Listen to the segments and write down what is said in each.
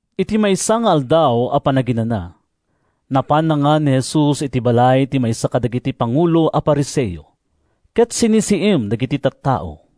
Iti maysa nga Aldaw a Panaginana, napan nangan ni Jesus iti balay ti maysa kadagiti pangulo a Fariseo, ket sinisiim dagiti tattao.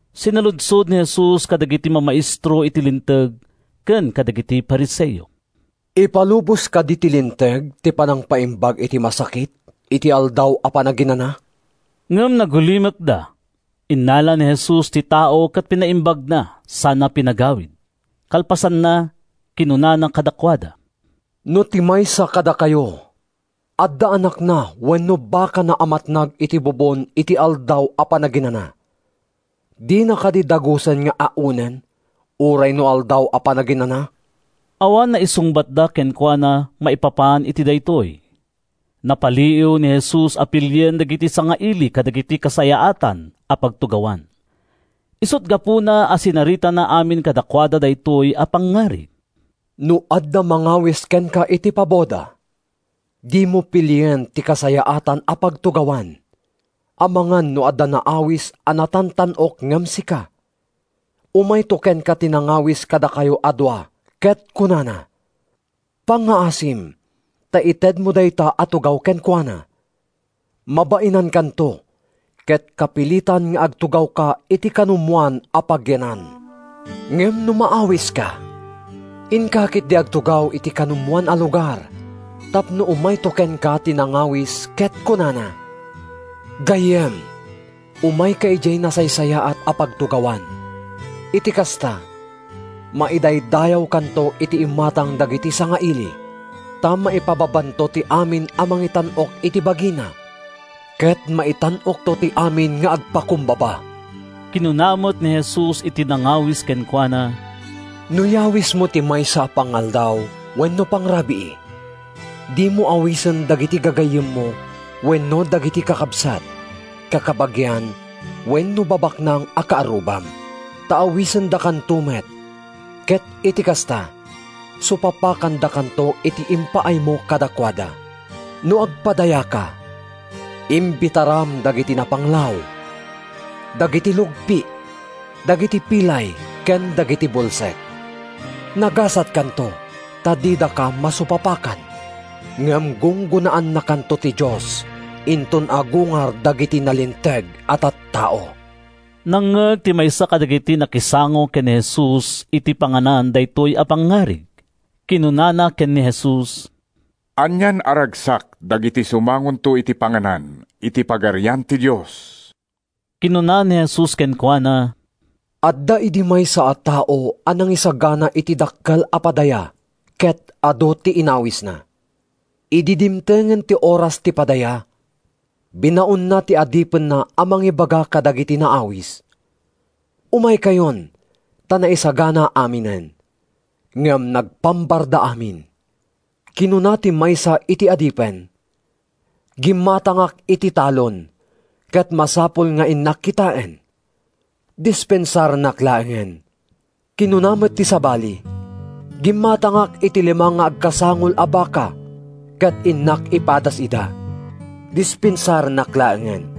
Sinaludsod ni Jesus kadagiti mamaestro iti Linteg ken kadagiti Fariseo, “Ipalubos kadi ti Linteg ti panangpaimbag iti masakit iti Aldaw a Panaginana?” Ngem nagulimekda. Innala ni Jesus ti tao ket pinaimbagna sana pinagawid. Kalpasanna, kinunana kadakuada, “No ti maysa kadakayo adda anakna wenno bakana a matnag iti bubon iti Aldaw a Panaginana, dina kadi dagusen nga aonen uray no Aldaw a Panaginana?” Awan naisungbatda kenkuana maipapan iti daytoy. Napaliiw ni Jesus a pilien dagiti sangaili dagiti kasayaatan a pagtugawan. Isut’ gapuna a sinaritana amin kadakuada daytoy a pangngarig: “No adda mangawis kenka iti paboda, dimo pilien ti kasayaatan a pagtugawan, amangan no adda naawis a natantan-ok ngem sika. Umayto kenka ti nangawis kadakayo a dua ket kunana, ‘Pangngaasim ta itedmo dayta a tugaw kenkuana.’ Mabainankanto ket kapilitan nga agtugawka iti kanumoan a pagyanan. “Ngem no maawiska, inka ketdi agtugaw iti kanumoan a lugar tapno umayto kenka ti nangawis ket kunana, ‘Gayyem, umayka idiay nasaysayaat a pagtugawan.’ Iti kasta, maidaydayawkanto iti imatang dagiti sangaili. Ta maipababanto ti amin a mangitan-ok iti bagina, ket maitan-okto ti amin nga agpakumbaba.” Kinuna met ni Jesus iti nangawis kenkuana, “No yawismo ti maysa a pangaldaw wenno pangrabii, dimo awisen dagiti gagayyemmo wenno dagiti kakabsat, kakabagian wenno babaknang a kaarrubam. Ta awisendakanto met, ket iti kasta, supapakandakanto iti impaaymo kadakuada. No agpadayaka, imbitaram dagiti napanglaw, dagiti lugpi, dagiti pilay ken dagiti bulsek. Nagasatkanto, ta didaka masupapakan. Ngem gunggonaannakanto ti Dios inton agungar dagiti nalinteg a tattao.” Nangngeg ti maysa kadagiti nakisango ken ni Jesus iti panganan daytoy a pangngarig. Kinunana ken ni Jesus, “Anian a ragsak dagiti sumangonto iti panganan iti Pagarian ti Dios!” Kinuna ni Jesus kenkuana, “Adda idi maysa a tao a nangisagana iti dakkel a padaya ket adu ti inawisna. Idi dimtengen ti oras ti padaya, binaonna ti adipenna a mangibaga kadagiti naawis, ‘Umaykayon, ta naisagana aminen.’ “Ngem nagpambarda amin. Kinuna ti maysa iti adipen, ‘Gimmatangak iti talon ket masapul nga innak kitaen. Dispensarennak laengen.’ Kinuna met ti sabali, ‘Gimmatangak iti lima nga agkasangol a baka ket innak ipadas ida. Dispensarennak laengen.’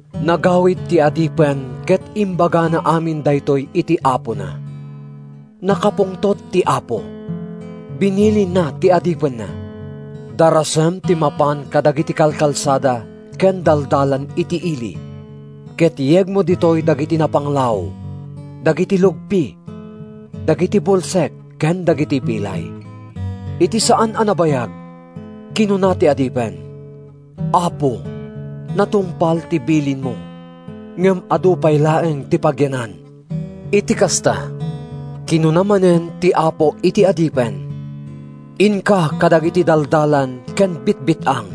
“Nagawid ti adipen ket imbagana amin daytoy iti apona. “Nakapungtot ti apo. Binilinna ti adipenna, ‘Darasem ti mapan kadagiti kalkalsada ken daldalan iti ili, ket yegmo ditoy dagiti napanglaw, dagiti lugpi, dagiti bulsek ken dagiti pilay.’ “Iti saan a nabayag, kinuna ti adipen, ‘Apo, natungpal ti bilinmo ngem adu pay laeng ti pagyanan.’ “Iti kasta, kinuna manen ti apo iti adipen, ‘Inka kadagiti daldalan ken bitbit-ang,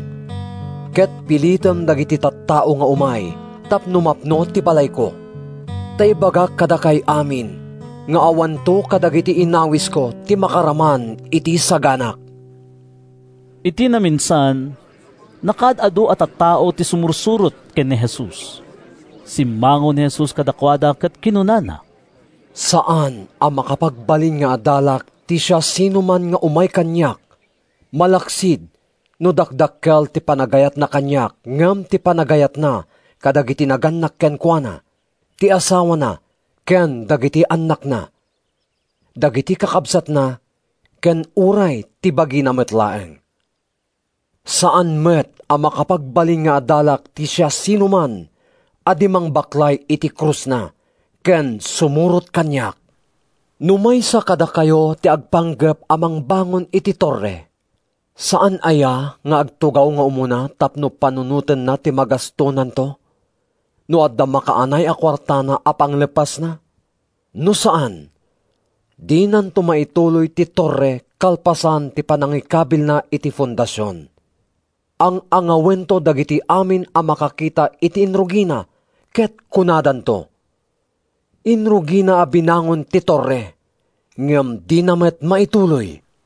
ket pilitem dagiti tattao nga umay tapno mapno ti balayko. Ta ibagak kadakay amin nga awanto kadagiti inawisko ti makaraman iti saganak.’” Iti naminsan, nakaad-adu a tattao ti sumursurot ken ni Jesus. Simmango ni Jesus kadakuada ket kinunana, “Saan a makapagbalin nga adalak ti siasinoman nga umay kaniak malaksid no dakdakkel ti panagayatna kaniak ngem ti panagayatna kadagiti nagannak kenkuana, ti asawana ken dagiti annakna, dagiti kakabsatna ken uray ti bagina met laeng. Saan met a makapagbalin nga adalak ti siasinoman a di mangbaklay iti krusna ken sumurot kaniak. “No maysa kadakayo ti agpanggep a mangbangon iti torre, saan aya nga agtugaw nga umuna tapno panunotenna ti magastonanto, no adda makaanay a kuartana a pangleppasna? No saan, dinanto maituloy ti torre kalpasan ti panangikabilna iti fondasion. Ang-angawento dagiti amin a makakita iti inrugina ket kunadanto, ‘Inrugina a binangon ti torre, ngem dina met maituloy!’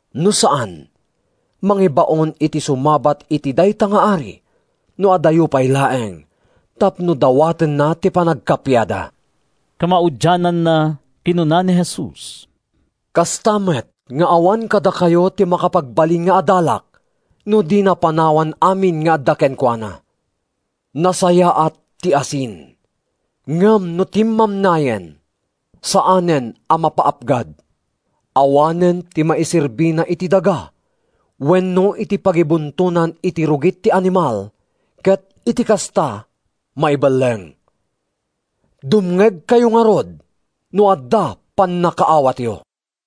No saan, mangibaon iti sumabat iti dayta nga ari no adayo pay laeng tapno dawatenna ti panagkappiada.” Kamaudiananna, kinuna ni Jesus, “Kasta met nga awan kadakayo ti makapagbalin nga adalak no dina panawan amin nga adda kenkuana.” “Nasayaat ti asin. Ngem no timmamnayen, saanen a mapaapgad. Awanen ti maiserbina iti daga wenno iti pagibuntonan iti rugit ti animal ket iti kasta maibelleng. “Dumngegkayo ngarud, no adda pannakaawatyo!”